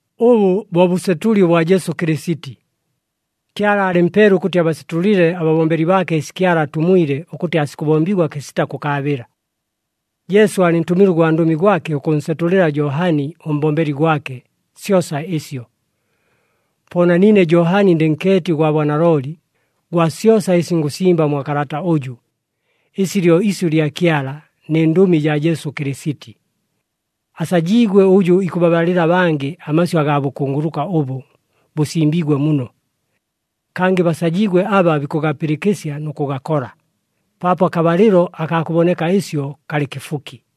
Ʉbʉ bo bʉsetʉli ʉbwa Jesu Kɨlɨsiti. Kyala aalɨmpeele ʉkʉtɨ abasetʉlɨle ababombeli baake ɨsi Kyala atumwile ʉkʉtɨ aasikʉbombigwa kɨsita kʉkaabɨla. Jesu aalɨntʉmile ʉgwandʉmi gwake ʉkʉnsetʉlɨla Johani ʉmbombeli gwake, syosa ɨsyo. Po na niine Johani ndɨ nkeeti ʉgwa bwanalooli, gwa syosa ɨsi ngʉsimba mwa kalata ʉjʉ, ɨsi lyo isyʉ lya Kyala nɨ Ndʉmi jaa Jesu Kɨlɨsiti. Asajiigwe ʉjʉ ikʉbabalɨla abangɨ amasyʉ agaa bʉkunguluka ʉbʉ bʉsimbiigwe muno. Kangɨ basajiigwe aba bikʉgapɨlɨkɨsya nʉ kʉgakola, paapo akabalɨlo akaa kʉboneka ɨsyo kalɨ kɨfuki.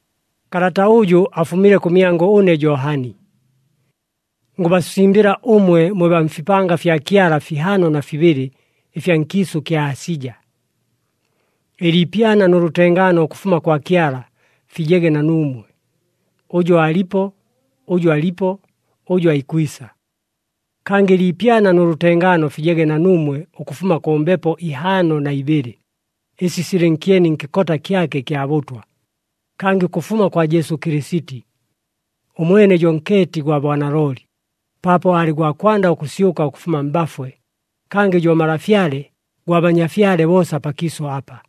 Kalata ʉjʉ afumile kʉmyangʉ ʉne Johani. Ngʉbasimbɨla ʉmwe mwe baa mfipanga fya Kyala fihaano na fibɨlɨ ɨfya nkiisʉ kya Asija. Ɨliipyana nʉ lʉtengaano ʉkʉfuma kwa Kyala fijege na nuumwe, ʉjʉ aalipo, ʉjʉ alipo, ʉjʉ aikwisa. Kangɨ ɨliipyana nʉ lʉtengaano fijege na nuumwe ʉkʉfuma kʉ Mbepo ihaano na ibɨlɨ, ɨsi silɨ nkyeni nkɨkota kyake ɨkya bʉtwa, kangɨ ʉkʉfuma kwa Jesu Kɨlɨsiti. Ʉmwene jo nkeeti gwa bwanalooli, paapo aalɨ gwa kwanda ʉkʉsyʉka ʉkʉfuma mbafwe, kangɨ jo Malafyale gwa banyafyale boosa pakiisʉ apa.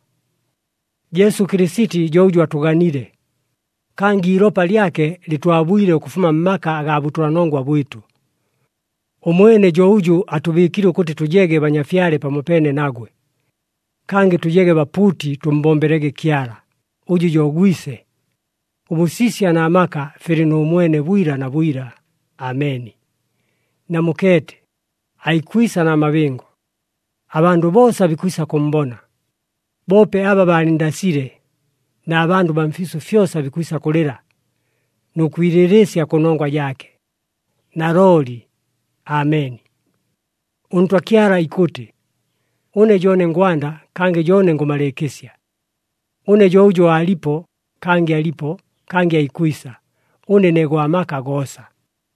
Jesu Kɨlɨsiti jo ʉjʉ atʉganile, kangɨ iilopa lyake lɨtwabwile ʉkʉfuma mmaka agaa bʉtʉlanongwa bwɨtʉ. Ʉmwene jo ʉjʉ atʉbɨɨkile ʉkʉtɨ tʉjege banyafyale pamopeene nagwe, kangɨ tʉjege bapuuti, tʉmmbombelege Kyala, ʉjʉ jo Gwise. Ʉbʉsisya na maka filɨ nʉ mwene, bwila na bwila! Ameni! Namukeete! Aikwisa na mabɨngo! Abandʉ boosa bikwisa kʉmmbona, boope aba baalɨnndasile, na bandʉ baa mfiisʉ fyosa bikwisa kʉlɨla, nʉ kwilɨlɨɨsya kʉnongwa jaake. Nalooli! Ameni. ɄNtwa Kyala ikʉtɨ, “Ʉne jo ʉne ngwanda, kangɨ jo ʉne ngʉmalɨɨkɨsya. Ʉne jo ʉjʉ aalipo, kangɨ alipo, kangɨ aikwisa. Ʉne ne Gwa maka goosa.”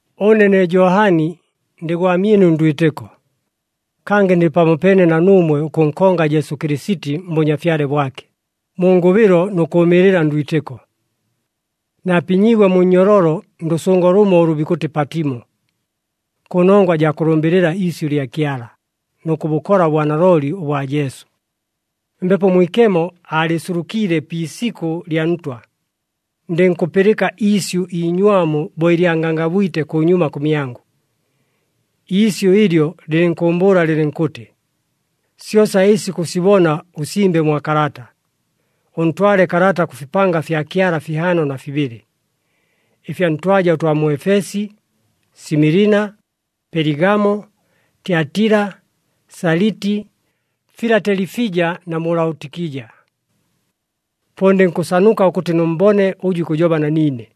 Ʉne ne Johani, ndɨ gwamyɨnu ndwitɨko, kangɨ ndɨ pamopeene na nuumwe ʉkʉnkonga Jesu Kɨlɨsiti mBʉnyafyale bwake, mu ngʉbɨlo nʉ kʉʉmɨɨlɨla ndwitɨko. Naapinyiigwe mu nnyololo ndʉsʉngo lʉmo ʉlʉ bikʉtɨ Patimo, kʉnongwa jaa kʉlʉmbɨlɨla iisyʉ lya Kyala, nʉ kʉbʉkola ʉbwanalooli ʉbwa Jesu. Mbepo Mwikemo aalɨɨsulukiile pi isikʉ lya Ntwa, ndɨnkʉpɨlɨka iisyʉ iinywamu bo ɨlya ngangabwite kʉnyuma kʉmyangʉ. Iisyʉ ɨlyo lɨlɨnkʉʉmbʉʉla lɨlɨnkʉtɨ, “Syosa ɨsi kʉsibona, ʉsimbe mwa kalata, ʉntwale kalata kʉ fipanga fya Kyala fihaano na fibɨlɨ, ɨfya ntwaja ʉtwa mu Efesi, Similina, Peligamo, Tyatila, Saliti, Filatelifija na mu Laotikija.” Po ndɨnkʉsanuka ʉkʉtɨ nʉmmbone ʉjʉ ikʉjoba na niine.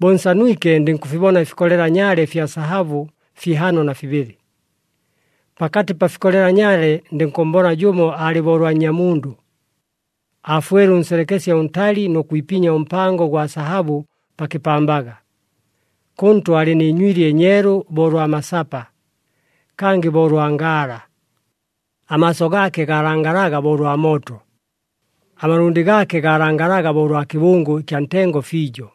Bo nsanwike ndɨnkʉfibona ɨfikolela nyaale ɨfya sahabʉ fihaano na fibɨlɨ. Pakatɨ pa fikolela nyaale ndɨnkʉmmbona jʉmo aalɨ bo ʉlwa Nnyamundʉ, aafwele ʉnselekesye ʉntali nʉ kwipinya ʉmpango ʉgwa sahabʉ pa kɨpambaga. Kʉntʉ aalɨ nɨ nywili ɨnyeelu bo ʉlwa masapa, kangɨ bo ʉlwa ngaala. Amaaso gaake gaalangalaga bo ʉlwa mooto. Amalʉndɨ gaake gaalangalaga bo ʉlwa kɨbʉngʉ ɨkya ntengo fiijo,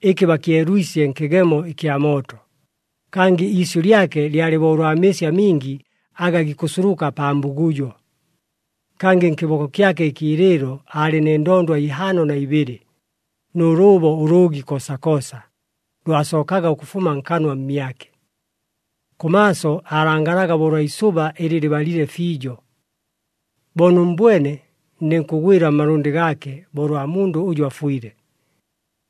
ɨkɨ bakyelwisye nkɨgemo ɨkya mooto, kangɨ iisyʉ lyake lyalɨ bo ʉlwa mɨɨsi amingi aga gikʉsuluka pa mbugujo. Kangɨ nkɨboko kyake ɨkiilɨɨlo aalɨ nɨ ndondwa ihaano na ibɨlɨ, nʉ lʉʉbo ʉlʉʉgi koosakoosa, lwasookaga ʉkʉfuma nkanwa mmyake. Kʉmaaso aalangalaga bo ʉlwa isʉba ɨlɨ lɨbalile fiijo. Bo nʉmmbwene ndɨnkʉgwɨla mmalʉndɨ gaake bo ʉlwa mundʉ ʉjʉ afwile.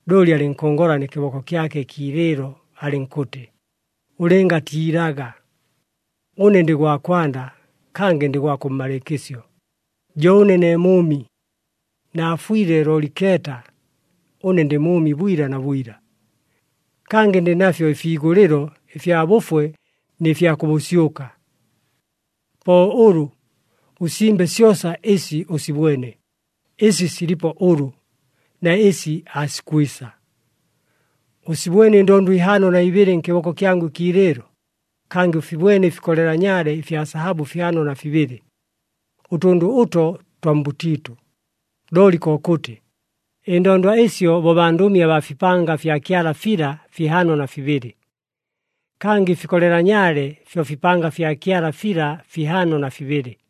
Looli alɨnkʉngola nɨ kɨboko kyake ɨkiilɨɨlo alɨnkʉtɨ, “Ʉlɨngatiilaga! Ʉne ndɨ gwa kwanda, kangɨ ndɨ gwa kʉmmalɨɨkɨsyo. Jo ʉne ne mʉʉmi. Naafwile, looli keeta! Ʉne ndɨ mʉʉmi bwila na bwila. Kangɨ ndɨ nafyo ɨfiigʉlɨlo ɨfya bʉfwe nɨ fya kʉ bʉsyʉka. “Po ʉlʉ, ʉsimbe syosa ɨsi ʉsibwene, ɨsi silipo ʉlʉ, na ɨsi aasikwisa. Ʉsibwene ɨndondwa ihaano na ibɨlɨ nkɨboko kyangʉ ɨkiilɨɨlo, kangɨ ʉfibwene ɨfikolela nyaale ɨfya sahabʉ fihaano na fibɨlɨ. Ʉtʉndʉ ʉto twa mbʉtiitʉ, looli kokʉtɨ, ɨndondwa ɨsyo bo bandʉmi abaa fipanga fya Kyala fila fihaano na fibɨlɨ, kangɨ ɨfikolela nyaale fyo fipanga fya Kyala fila fihaano na fibɨlɨ.”